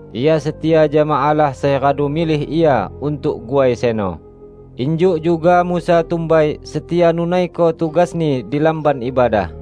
Ia setia jama Allah sai radu milih Ia untuk guai seno, injuk juga Musa tumbai setia nunaiko tugasni di Lamban Ibadah.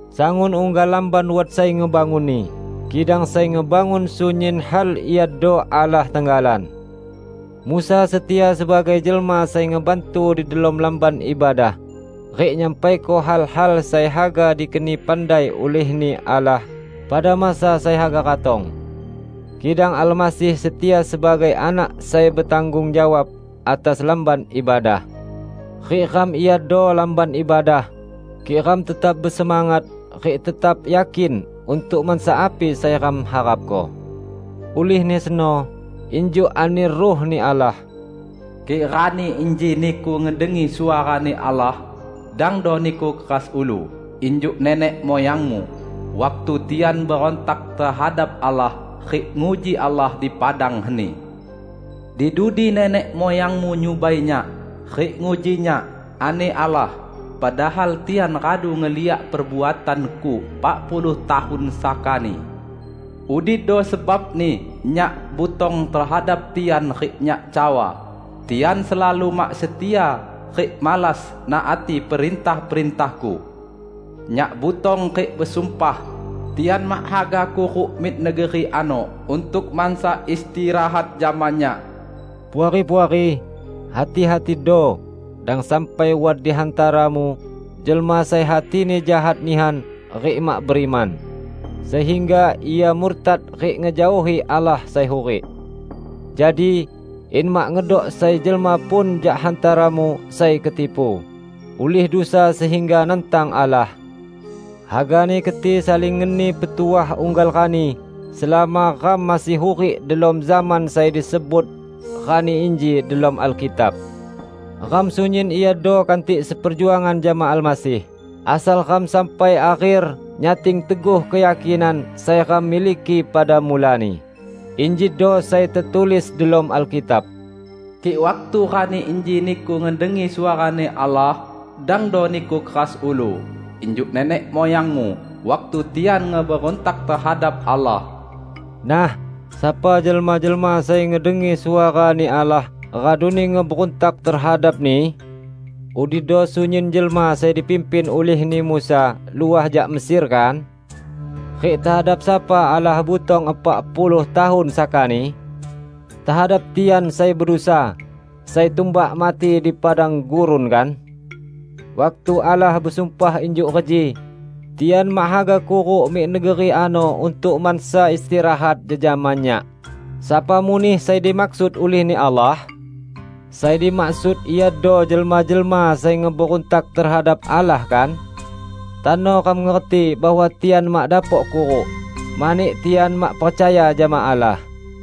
Sangun unggal lamban wat sai ngebangunni, kidang sai ngebangun sunyin hal iado Allah tenggalan. Musa setia sebagai jelma sai ngebantu di delom Lamban Ibadah rik nyampaiko hal-hal sai haga dikeni pandai ulih-Ni Allah pada masa sai haga ratong. Kidang Almasih setia sebagai Anak sai betanggung jawab atas Lamban Ibadah. Rik ram iado Lamban Ibadah, kik ram tetap besemangat rik tetap yakin untuk mansa api sai ram harapko. Ulihni seno, injuk ani Ruh-Ni Allah, "Kik rani inji niku ngedengi suara-Ni Allah, dangdo niku keras ulu, injuk nenek muyangmu, waktu tian berontak tehadap Allah, rik nguji Allah di padang heni. 'Di dudi nenek muyangmu nyubai Nyak, rik nguji Nyak,' ani Allah, 'padahal tian radu ngeliak perbuatan-Ku epak puluh tahun sakani.' Udido sebabni Nyak butong tehadap tian rik Nyak cawa, 'Tian selalu mak setia, rik malas naati perintah-perintah-Ku.' Nyak butong rik besumpah, 'Tian mak haga kuruk mik negeri ano untuk mansa istirahat jama Nyak.' " Puari-puari, hati-hatido dang sampai wat di hantaramu jelma sai hatini jahat nihan rik mak beriman, sehingga ia murtad rik ngejaohi Allah sai hurik! Jadi, in mak ngedok sai jelma pun jak hantaramu sai ketipu, ulih dusa sehingga nantang Allah, hagani keti saling ngeni petuah unggal rani selama ram masih hurik delom zaman sai disebut "Rani Inji" delom Alkitab. Ram sunyin iado kantik seperjuangan jama Almasih, asal ram sampai akher nyating teguh keyakinan sai ram miliki pada mulani. Injido sai tetulis delom Alkitab, "Kik waktu rani inji niku ngedengi suara-Ni Allah, dangdo niku keras ulu, injuk nenek muyangmu, waktu tian ngeberuntak tehadap Allah." Nah, sapa jelma-jelma sai ngedengi suara-Ni Allah raduni ngeberuntak tehadap-Ni? Udido sunyin jelma sai dipimpin ulihni Musa luah jak Mesir kan? Rik tehadap sapa Allah butong epak puluh tahun sakani? Tehadap tian sai bedusa, sai tumbak mati di padang gurun, kan? Waktu Allah besumpah injuk reji, "Tian mak haga kuruk mik negeri ano untuk mansa istirahat jejama Nyak" -- sapa muneh sai dimaksud ulih-Ni Allah? Sai dimaksud iado jelma-jelma sai ngeberuntak tehadap Allah, kan? Tano ram ngerti bahwa tian mak dapok kuruk, mani tian mak percaya jama Allah.